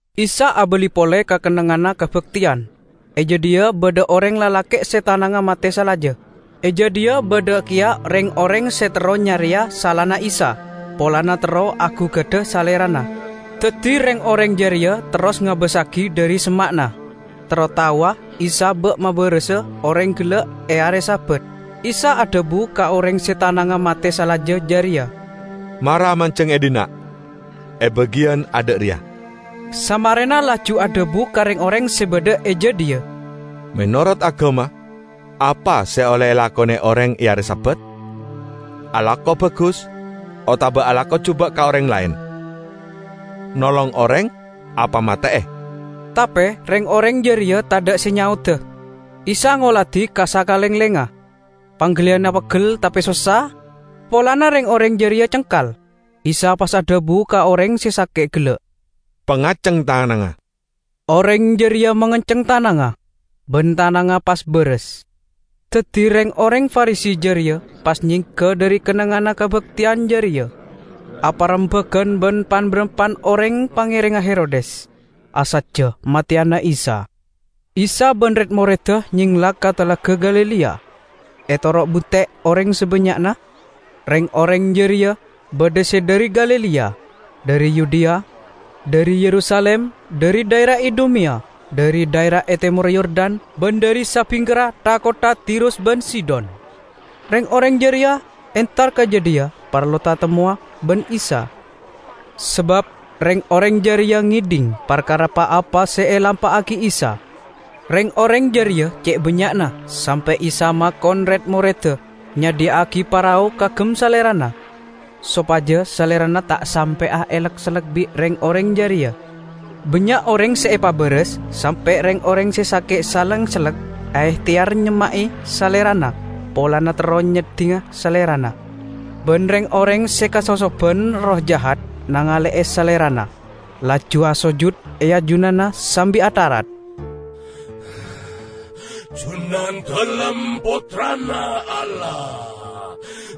Isa abali pole ka kennengnganna kabakteyan. E jadhiya badha oreng lalake' se tanangnga mate salaja. E jadhiya badha keya reng-oreng se terro nyareya salana Isa, polana terro agugada Salerana. Daddi reng-oreng jareya terros ngabassagi dhari semma'na, terro taowa Isa ba' mabarasa oreng gella' e are Sabat. Isa adhabu ka oreng se tanangnga mate salaja jareya, "Mara manjeng e dhinna', e bagiyan adha' reya." Samarena laju adhabu ka reng-oreng se badha e jadhiya, "Menorot agama, apa se olle elakone oreng e are Sabat? Alako bagus otaba alako juba' ka oreng laen? Nolong oreng apa mate'e?" Tape reng-oreng jareya tadha' se nyaoda. Isa ngoladi ka sakalenglengnga. Panggaliyanna peggel tape sossa, polana reng-oreng jareya cengkal. Isa pas adhabu ka oreng se sake' gella', "Pangaceng tanangnga." Oreng jareya mangenceng tanangnga, ban tanangnga pas baras. Daddi reng-oreng Farisi jareya pas nyengga dhari kennengnganna kabakteyan jareya, aparembagan ban pan-barampan oreng pangerengnga Herodes, asajja mateyana Isa. Isa ban red-moredda nyengla ka Talaga Galilea, etoro' bunte' oreng sabannya'na. Reng-oreng jareya badha se dhari Galilea, dhari Yudea, dhari Yerusalim, dhari dhaera Idumeya, dhari dhaera e temorra Yordan, ban dhari sabingkerra tha-kottha Tirus ban Sidon. Reng-oreng jareya entar ka jadhiya parlo tatemmowa ban Isa, sabab reng-oreng jareya ngedhing parkara pa-apa se la elampa'agi Isa. Reng-oreng jareya ce' bannya'na sampe' Isa makon red-moredda nyadhiya'agi parao kaagem Salerana, sopaja Salerana ta' sampe'a elek-sellek bi' reng-oreng jareya. Bannya' oreng se epabaras, sampe' reng-oreng se sake' saleng sellek aehteyar nyemma'e Salerana polana terro nyeddinga Salerana. Ban reng-oreng se kasosoban erroh jahat nangale'e Salerana, laju asojud e ajunanna sambi atharat, "Junandalem Pottrana Allah!"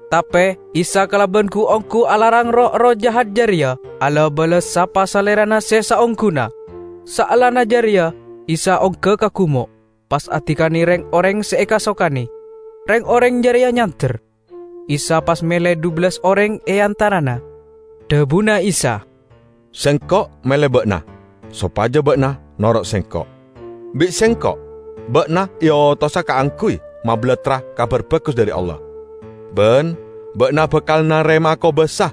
Tape Isa kalaban gu-onggu alarang roh-erroh jahat jareya ala-bala sapa Salerana se saongguna. Saellana jareya Isa ongga ka gumo', pas adikane reng-oreng se ekasokane. Reng-oreng jareya nyander, Isa pas mele dhubellas oreng e antarana. Dhabuna Isa, "Sengko' mele ba'na sopaja ba'na noro' Sengko'. Bi' Sengko' ba'na eotosa kaangguy mabalattra Kabar Bagus dhari Allah, ban ba'na bakal narema'a kobasa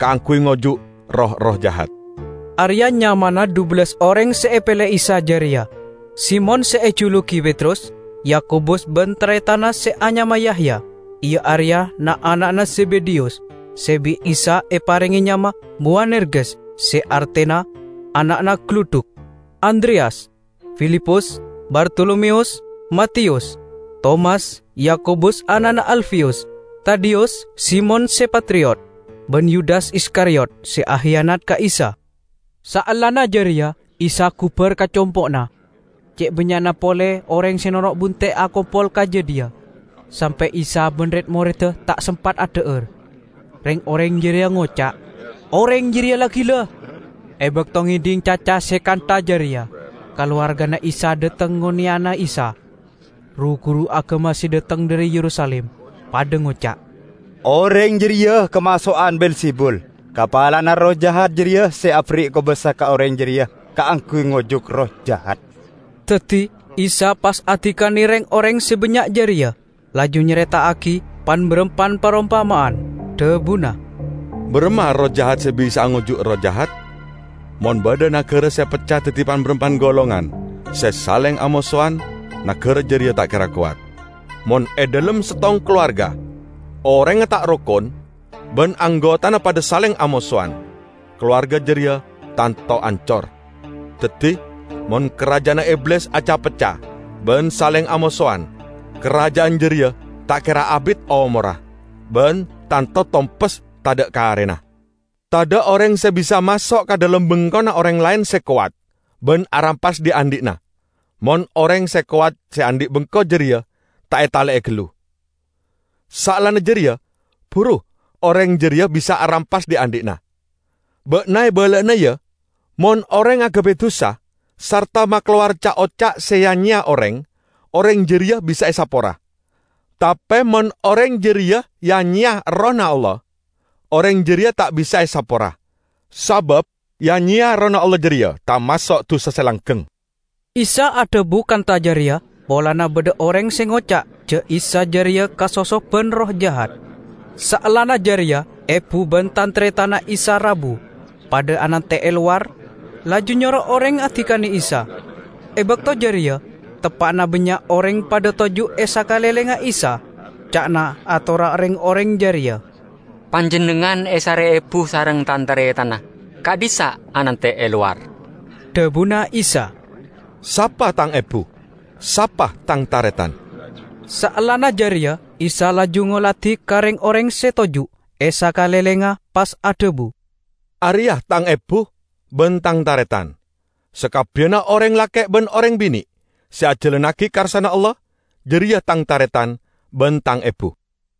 kaangguy ngojuk roh-erroh jahat." Areya' nyamana dhubellas oreng se epele Isa jareya: Simon (se ejulugi Petrus), Yakobus ban taretanna se anyama Yahya, iya areya na'-ana'na Zebedeyus (se bi' Isa eparenge nyama Bowanerges se artena "ana'na galudhuk"), Andreyas, Filipus, Bartolomeyus, Matiyus, Tomas, Yakobus ana'na Alfeyus, Tadeyus, Simon se Patriot, ban Yudas Iskariyot se akiyanat ka Isa. Saellana jareya Isa gubar ka compo'na. Ce' bannya'na pole oreng se noro' bunte' akompol ka jadhiya, sampe' Isa ban red-moredda ta' sempat adha'ar. Reng-oreng jareya ngoca', "Oreng jareya la gila!" E bakto ngedhing caca se kantha jareya, kalowargana Isa dhateng ngoneyana Isa. Ru-guru agama se dhateng dhari Yerusalim padha ngoca', "Oreng jareya kamaso'an Be'elzebul! Kapalana erroh jahat jareya se aberri' kobasa ka oreng jareya kaangguy ngojuk erroh jahat." Daddi Isa pas adikane reng-oreng se bannya' jareya, laju nyareta'agi pan-barampan parompama'an. Dhabuna, "Baramma erroh jahat se bisa'a ngojuk erroh jahat? Mon badha nagara se pecca daddi pan-barampan golongan se saleng amosowan, nagara jareya ta' kera kowat. Mon e dhalem settong kalowarga orengnga ta' rokon ban anggotana padha saleng amosowan, kalowarga jareya tanto ancor. Daddi mon karaja'anna Iblis aca-pecca ban saleng amosowan, karaja'an jareya ta' kera abit omorra ban tanto tompes tadha' karena. Tadha' oreng se bisa maso' ka dhalem bengkona oreng laen se kowat ban arampas dhi'-andhi'na mon oreng se kowat se andhi' bengko jareya ta' etale'e gallu. Saellana jareya, buru oreng jareya bisa arampas dhi'-andhi'na. Ba'na ebala'ana, ya! Mon oreng agabay dusa sarta makalowar ca'-oca' se ya-nyeya oreng, oreng jareya bisa esapora. Tape mon oreng jareya ya-nyeya Errohna Allah, oreng jareya ta' bisa esapora! Sabab ya-nyeya Errohna Allah jareya tamaso' dusa se langgeng." ( Isa adhabu kantha jareya polana badha oreng se ngoca' ja' Isa jareya kasosoban erroh jahat.) Saellana jareya ebu ban tan-taretanna Isa rabu, padha anante' e lowar, laju nyoro oreng adikane Isa. E bakto jareya teppa'na bannya' oreng padha toju' e sakalenglengnga Isa. Ca'na atorra reng-oreng jareya, "Panjennengngan esare ebu sareng tan-taretanna. Ka'dhissa' anante' e lowar." Dhabuna Isa, "Sapa Tang ebu? Sapa Tang taretan?" Saellana jareya Isa laju ngoladi ka reng-oreng se toju' e sakalenglengnga pas adhabu, "Areya' Tang ebu ban Tang taretan! Sakabbiyanna oreng lake' ban oreng bine' se ajalannagi karsana Allah, jareya Tang taretan ban Tang ebu."